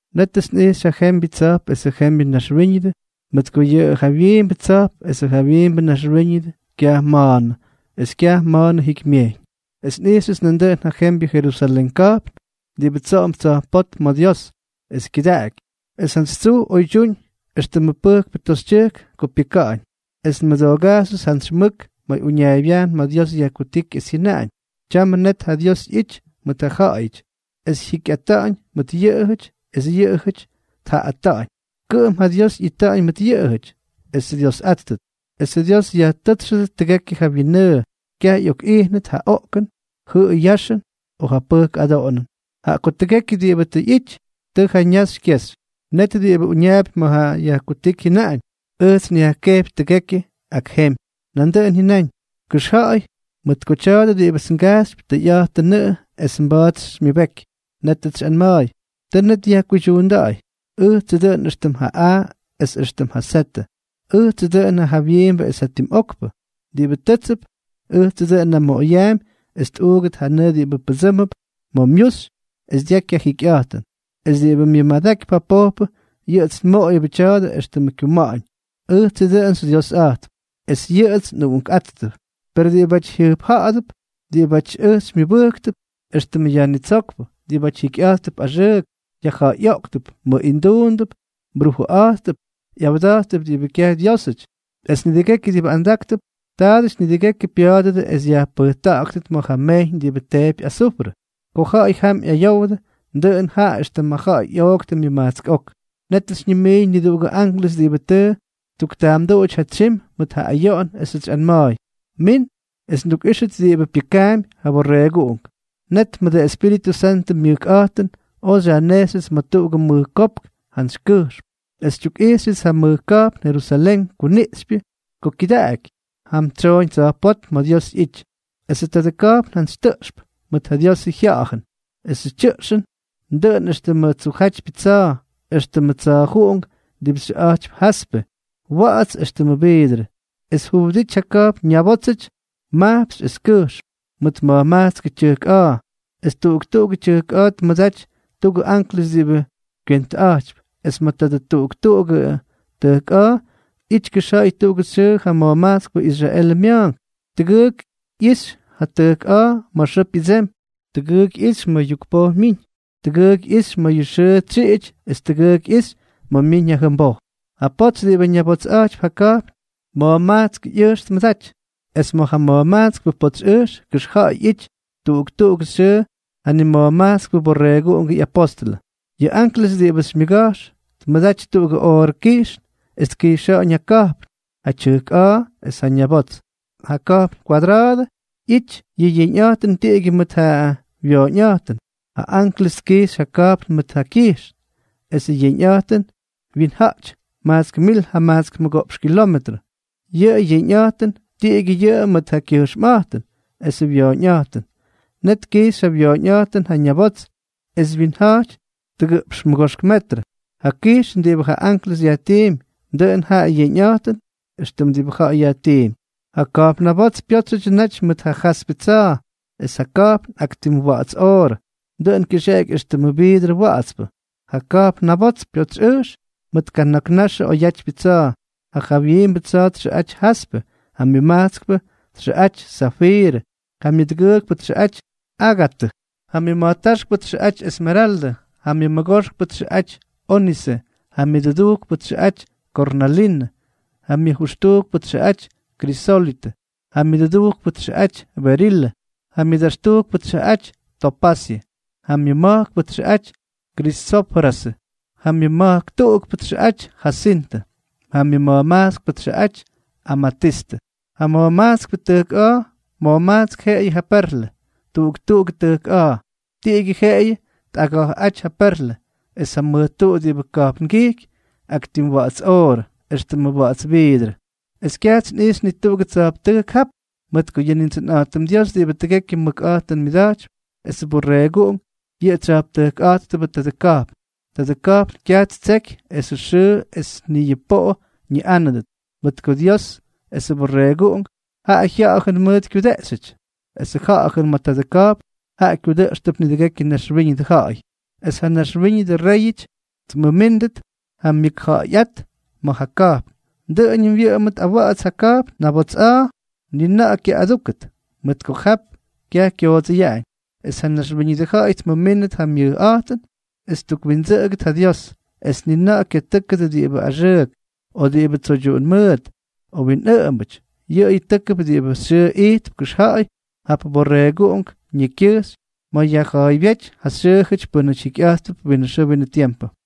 Nétʉts nꞌijxy ja jembyʉ tsa̱jp esʉ jembyʉ naxwíñʉdʉ, mʉt ko yʉ jawyiimbʉ tsa̱jp esʉ jawyiimbʉ naxwíñʉdʉ kyaj ma̱a̱nʉ, es kyaj ma̱a̱nʉ jikymyejyñ. Es nꞌijxyʉts nandʉꞌʉn ja jembyʉ Jerusalén ka̱jpn diꞌibʉ tsoꞌomp tsa̱jpótm ma̱ Dios, es kyʉdaꞌaky, es jantsy tsuj oydyúñ éxtʉmʉ pʉjkpʉ toxytyʉjk ko pyʉka̱ꞌa̱ñ. Es nmʉdoogajxyʉts jantsy mʉk ma̱ uñaaybyajn ma̱ Dios yajkutíky, es jyʉnaꞌañ: —Tyamʉ net ja Dios ꞌyity mʉt ja ja̱ꞌa̱yʉty, es jyikyꞌata̱ꞌa̱ñ mʉt yʉꞌʉjʉty, es yʉꞌʉjʉty tja̱ꞌa̱yꞌata̱ꞌa̱ñ. Kʉꞌʉm ja Dios ꞌyita̱ꞌa̱ñ mʉt yʉꞌʉjʉty, es Dyiosꞌátʉdʉt. Esʉ Dios yajtʉ́tsxʉdʉt tʉgekyʉ ja wyinnʉʉ. Kyaj ꞌyokꞌijnʉt ja oꞌkʉn, jʉꞌʉy yaxʉn o ja pʉjk adoꞌonʉn, jaꞌa ko tʉgekyʉ diꞌibʉ tʉ ꞌyity, tʉ jaꞌa ñaxy kyexy. Net ja diꞌibʉ uñaapy ma̱ yajkutíky jyʉnáñ: —Ʉjts nyajkejpy tʉgekyʉ ak jemy. Nandʉꞌʉn jyʉnáñ: —Kʉxja̱ꞌa̱y, mʉt ko tya̱a̱dʉ diꞌibʉts ngajxypy, tʉyꞌa̱jtʉnʉꞌʉ es mba̱a̱t xymyʉbeky. Nétʉts xyꞌanma̱a̱y: —Tʉ net yajkuydyuunda̱ꞌa̱y. Ʉjtsʉ dʉꞌʉn éxtʉm ja A es éxtʉmʉ Z, ʉjtsʉ dʉꞌʉn ja jawyiimbʉ es ja tim okpʉ. Diꞌibʉ tʉ́tsʉp, ʉjtsʉts nnamoꞌoyʉp es tꞌuugʉt ja nʉʉ diꞌibʉ pʉdsʉʉmp ma̱ myuxy es dyaky ja jikyꞌa̱jtʉn. Es diꞌibʉ myʉmadakypy ja pojpʉ, yʉꞌʉts nmoꞌoyʉbʉ tya̱a̱dʉ éxtʉmʉ kyuma̱ꞌa̱ñ, ʉjtsʉ dʉꞌʉn xyDyiosꞌátʉp, es yʉꞌʉts nꞌuꞌunkꞌátʉt. Per diꞌibáty jyʉjpja̱ꞌa̱dʉp, diꞌibátyʉts ʉj xykyamʉbʉjktʉp éxtʉmʉ Yajnitsókpʉ, diꞌibáty jikyꞌa̱jttʉp axʉʉk, yajja̱ꞌa̱yꞌoꞌktʉp, mʉꞌinduundʉp, brujʉꞌa̱jttʉp, ꞌyawda̱jttʉp diꞌibʉ kyaj Dyiósʉty, es nidʉgekyʉ diꞌibʉ andáktʉp, taadʉty nidʉgekyʉ pya̱a̱dʉdʉ es yajpʉjta̱ꞌa̱gʉt ma̱ ja mejyñ diꞌibʉ teepy azufrʉ. Ko ja̱ꞌa̱y jam ꞌyayowdʉ, dʉꞌʉn jaꞌa éxtʉmʉ ja̱ꞌa̱y ꞌyooktʉ myʉmajtsk ok. Nétʉts xyñimiiñ niduꞌugʉ anklʉs diꞌibʉ tʉ ttuktaamduꞌuty ja tsyim mʉt ja ayoꞌon, esʉts xyꞌanma̱a̱y: —Min es ndukꞌíxʉt diꞌibʉ pyʉkaampy ja Borreeguꞌunk. Net mʉdʉ Espíritʉ Santʉ myʉkꞌa̱jtʉn oj xyajnejxyʉts ma̱ tuꞌugʉ mʉj kopk jantsy kʉjxm, es xytyukꞌijxyʉts ja mʉj ka̱jpn Jerusalén kuniꞌxypyʉ ko kyʉdaꞌaky, jam tsyoꞌoñ tsa̱jpótm ma̱ Dios ꞌyity. Esʉ tadʉ ka̱jpn jantsy tʉꞌxp mʉt ja Diosʉ jya̱jʉn. Esʉ tyʉꞌxʉn dʉꞌʉn éxtʉmʉ tsujjátypyʉ tsa̱a̱, éxtʉmʉ tsa̱a̱juꞌunk diꞌibʉ xʉꞌa̱jtypy jaspe, wa̱ꞌa̱ts éxtʉmʉ viidrʉ. Es juwʉdity ja ka̱jpn ñabótsyʉty majpxy es kʉjxm, mʉt ma̱jmajtskʉ tyʉjk a̱a̱. Es tuꞌuk tuꞌugʉ tʉjk a̱a̱ tmʉdaty tuꞌugʉ anklʉs diꞌibʉ kywentʉꞌa̱jtypy. Es ma̱ tadʉ tuꞌuk tuꞌugʉ tʉjk a̱a̱ ꞌyity kʉxja̱ꞌa̱y tuꞌugʉ xyʉʉ ja ma̱jmajtskpʉ Israelʉ mya̱a̱nk. Tʉgʉʉk ꞌyixy ja tʉjk a̱a̱ ma̱ xʉʉ pyʉdsemy, tʉgʉʉk ꞌyixy ma̱ yukpoj myiñ, tʉgʉʉk ꞌyixy ma̱ ja xʉʉ tsyiꞌity es jatʉgʉʉk ꞌyixy ma̱ myiñ ja jʉmboj. Ja potsy diꞌibʉ ñabotsꞌa̱jtypy ja ka̱jpn, ma̱jmajtskʉ ꞌyʉjx tmʉdaty. Es ma̱ ja ma̱jmajtskpʉ potsy ʉjx kʉxja̱ꞌa̱y ꞌyity tuꞌuk tuꞌugʉ xyʉʉ ja nima̱jmajtskpʉ Borreeguꞌungʉ ꞌyapóstʉlʉ. Yʉ anklʉs diꞌibʉts xymyʉga̱jx tmʉdaty tuꞌugʉ oorʉ kijxn, es tkijxa̱ꞌa̱ñ ja ka̱jpn, ja tyʉjk a̱a̱ es ja ñabots. Ja ka̱jpn kwadra̱a̱dʉ ꞌyity, yʉ yeñꞌa̱jtʉn tiꞌigyʉ mʉt ja wyooñꞌa̱jtʉn. Ja anklʉs tkijxy ja ka̱jpn mʉt ja kyijxn, esʉ yeñꞌa̱jtʉn wyinja̱jty majtsk mil jamajtsk mʉgoꞌpx kilometrʉ. Yʉ yeñꞌa̱jtʉn, tiꞌigyʉ yʉꞌʉ mʉt ja kyʉjxmꞌa̱jtʉn esʉ wyooñꞌa̱jtʉn. Net tkijxy ja wyooñꞌa̱jtʉn ja ñabots, es wyinja̱jty tʉgʉꞌpx mʉgoxk metrʉ. Ja kijxn diꞌibʉ ja anklʉs yajtiimpy, dʉꞌʉn ja yeñꞌa̱jtʉn éxtʉm diꞌibʉ ja̱ꞌa̱y yajtiimpy. Ja ka̱jpn nabots pyótsyʉdyʉ naty mʉt ja jaspe tsa̱a̱. Es ja ka̱jpn, ak tim wa̱ꞌa̱ts oorʉ, dʉꞌʉn kyʉxeꞌeky éxtʉmʉ viidrʉ wa̱ꞌa̱tspʉ. Ja ka̱jpn nabots pyotsyꞌʉjx mʉt kana̱k naxʉ oyatypyʉ tsa̱a̱. Ja jawyiimbʉ tsa̱a̱ txʉꞌaty jaspe. Ja myʉmajtskpʉ txʉꞌaty zafiirʉ, ja myʉdʉgʉʉkpʉ txʉꞌaty ágatʉ, ja myʉma̱jtáxkpʉ txʉꞌaty esmeraldʉ, ja myʉmʉgoxkpʉ txʉꞌaty ónise, ja myʉdʉdujkpʉ txʉꞌaty kornalinʉ, ja myʉjʉxtujkpʉ txʉꞌaty krisólitʉ, ja myʉduktujkpʉ txʉꞌaty berilʉ, ja myʉdaxtujkpʉ txʉꞌaty topasyʉ, ja myʉma̱jkpʉ txʉꞌaty krisoprasʉ, ja myʉma̱jk tuꞌukpʉ txʉꞌaty jasintʉ, ja myʉma̱jmajtskpʉ txʉꞌaty amatistʉ. Ja ma̱jmajtskpʉ tʉjk a̱a̱, ma̱jmajtsk jeꞌeyʉ ja perlʉ. Tuꞌuk tuꞌugʉ tʉjk a̱a̱, tiꞌigyʉ jeꞌeyʉ tꞌaga̱jꞌáty ja perlʉ. Es ja mʉj tuꞌu diꞌibʉ ka̱jpngijky, ak tim wa̱ꞌa̱ts oorʉ, éxtʉmʉ wa̱ꞌa̱ts viidrʉ. Es kyajts nꞌijxy ni tuꞌugʉ tsa̱jptʉjk jap, mʉt ko yʉ Nindsʉnꞌa̱jtʉm Dios diꞌibʉ tʉgekyʉ mʉkꞌa̱jtʉn myʉda̱jtypy, esʉ Borreeguꞌunk, yʉꞌʉ tsya̱jptʉjkꞌa̱jttʉbʉ tadʉ ka̱jpn. Tadʉ ka̱jpn kyaj ttseky esʉ xʉʉ es ni yʉ poꞌo ñiꞌánʉdʉt, mʉt ko Dios esʉ Borreeguꞌunk, jaꞌa jya̱jʉn mʉʉt kyudeꞌxyʉty. Es ja ja̱jʉn ma̱ tadʉ ka̱jpn, jaꞌa kyudʉꞌxʉp nidʉgekyʉ naxwíñʉdʉ ja̱ꞌa̱y, es ja naxwíñʉdʉ réyʉty tmʉmíndʉt ja myʉkja̱ꞌa̱yꞌát ma̱ ja ka̱jpn. Dʉꞌʉñʉm wyʉꞌʉmʉt awa̱ꞌa̱ts yʉ ka̱jpn nabots a̱a̱. Ni na̱ꞌa̱ kyaꞌꞌadúkʉt, mʉt ko jap kyaj kyoodsʉyaꞌañ. Es ja naxwíñʉdʉ ja̱ꞌa̱y tmʉmíndʉt ja myʉjꞌa̱jtʉn es ttukwindsʉꞌʉgʉdʉt ja Dios. Es ni na̱ꞌa̱ kyatʉ́kʉdʉ diꞌibʉ axʉʉk, o diꞌibʉ tsoydyuꞌun mʉʉt, o winꞌʉꞌʉmbʉty, yʉꞌʉyʉ tʉ́kʉdʉp diꞌibʉ xyʉʉ ijtp kʉxja̱ꞌa̱y jap Borreeguꞌunk ñekykyʉjxy ma̱ yajja̱a̱ybyéty ja xyʉʉjʉty pʉ́nʉty jikyꞌa̱jttʉp winʉ xʉʉ winʉ tiempʉ.